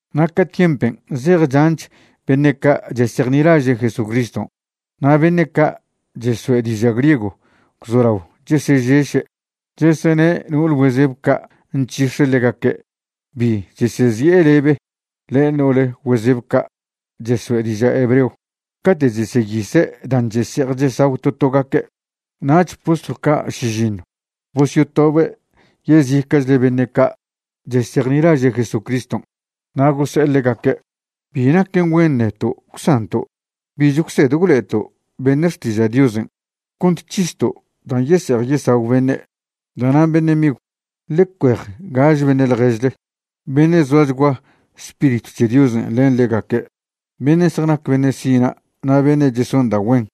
Na' ca tiempen' zej chanch beṉe' ca' chesejnilaže' Jesucriston' na' beṉe' ca' cheso'e diža' griego gwzolao chesežeše', chesene' no'ol güezeb ca' nc̱hix̱e ḻegaque' bi chesezi'e lebe len no'ole güezeb ca' cheso'e diža' hebreo cate' cheseyise' dan' chese'ej chesagw to togaque'. Nach postlw ca' šižiṉw bosyotobe' yezica'chle beṉe' ca' chesejnilaže' Jesucriston' na' gose'e ḻegaque': ―Bi naquen güen neto' gwsanto' bich gwsed gwlo'eto' beṉe' xtiža' Diosen' cont c̱histo' dan' yese'ej yesagw beṉe'. Da'nan' beṉe' migw, ḻe cuej gaže beṉe' ḻježle, beṉe' zoachgua Spiritw c̱he Diosen' len ḻegaque', beṉe' zjanac beṉe' sina' na' beṉe' cheson da' güen,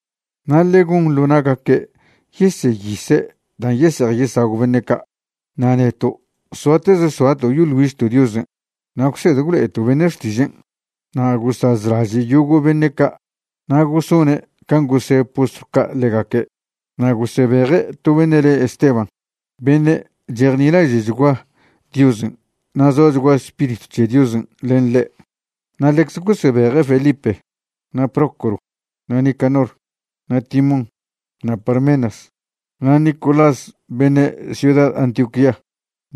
na' ḻe gon ḻo na'gaque' yeseyise' dan' yese'ej yesagw beṉe' ca'. Na' neto' soateze soato' yoḻ güižto' Diosen' na' gwsed gwlo'eto' beṉe' xtižen'. Na' gosazlaže' yogo' beṉe' ca' na' gosone' can' gose' postlw ca' ḻegaque', na' gosebeje' to beṉe' le Esteban beṉe' chejnilaže'chgua Diosen' na' zoachgua Spiritw c̱he Diosen' len ḻe'. Na' ḻecze gosebeje' Felipe, na' Prócoro, na' Nicanor, na' Timón, na' Parmenas, na' Nicolás beṉe' ciuda Antioquía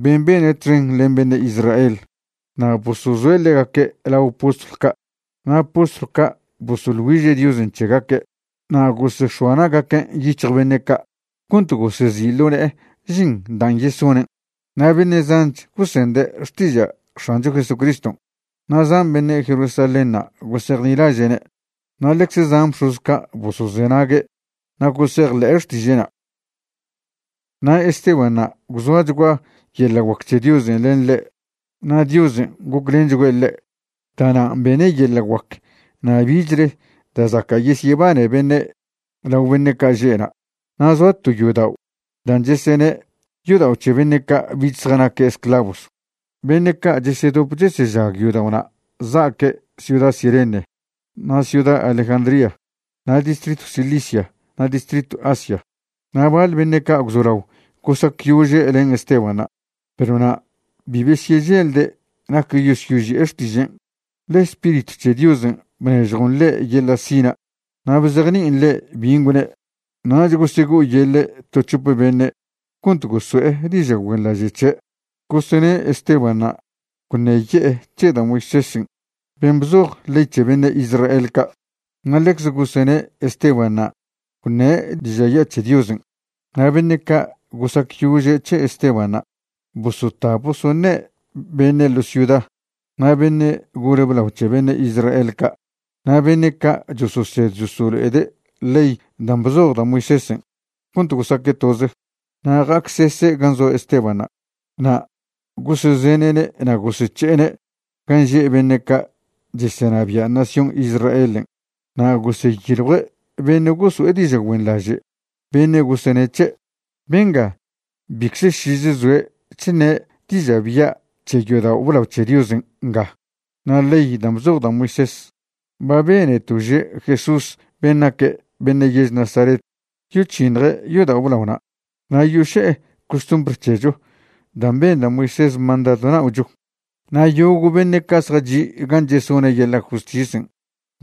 ben' bene' txen len beṉe' Israel. Na' bosozoe' ḻegaque' lao postlw ca' na' postlw ca' bosoḻ güiže' Diosen' c̱hegaque' na' gosex̱oa na'gaquen' yic̱hj beṉe' ca' cont gosezi' ḻo ne'e žin dan' yesonen'. Na' beṉe' zanch gosende' xtiža' X̱ancho Jesucriston', na' zan beṉe' Jerusalénṉa' gosejnilaže'ne' na' ḻecze zan bx̱oz ca' bosozenague' na' gosejḻe'e xtiže'na'. Na' Estebanṉa' gwzoachgua yeḻa' guac c̱he Diosen' len ḻe' na' Diosen' goclenchgüe' ḻe'. Da'nan' bene' yeḻa' guac na' bichle da' zaca' yesyebane beṉe' lao beṉe' ca' že' na'. Na' zoa to yodao' dan' chesene' Yodao' c̱he Beṉe' ca' Bich Zjanaque' Esclavos. Beṉe' ca' chesedop chesežag yodao'na' za'aque' ciuda Cirene na' ciuda Alejandría na' distritw Cilicia na' distritw Asia. Na' baḻ beṉe' ca' gwzolao gosacyože' len Estebanṉa', perw na' bi besyeželde' nac yosyoži'e xtižen', ḻe Spiritw c̱he Diosen' bnežjon ḻe' yeḻa' sina' na' bzejni'in ḻe' bin' gwne'. Nach gosego'oyeḻe' to c̱hop beṉe' cont goso'e diža' güenḻaže' c̱he', gosene' Estebanṉa' gwṉeye'e c̱he da' Moisésen' ben' bzoj ley c̱he beṉe' Israel ca'. Na' ḻecze gosene' Estebanṉa' gwṉe' diža' ya' c̱he Diosen'. Na' beṉe' ca' gosacyože' c̱he Estebanṉa' bosota bosoṉe' beṉe' ḻo ciuda na' beṉe' gole blao c̱he beṉe' Israel ca' na' beṉe' ca' chososed chosolo'ede' ley dan' bzoj da' Moisésen' cont gosaque' toze. Na' ja'acsese' gan' zoa Estebanṉa' na' gosezene'ne' na' gosec̱he'ene' gan' že' beṉe' ca' chesenabia' nación Israelen'. Na' goseyiljue' beṉe' goso'e diža' güenḻaže' beṉe' gosene' c̱he': ―Benga bicze šize zoe' chṉe' diža' bya' c̱he yodao' blao c̱he Diosen' nga na' ley dan' bzoj da' Moisés. Ba beneto' že' Jesús ben' naque' beṉe' yež Nazaret yoc̱hiṉje' yodao' blaona' na' yoše'e costumbr c̱hecho dan' ben da' Moisés mandadw na'ocho. Na' yogo' beṉe' ca' zjachi' gan' chesone' yeḻa' justisen'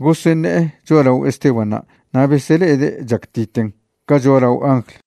goseṉe'e cho'alao Estebanṉa' na' besele'ede' chactiten ca cho'alao angl.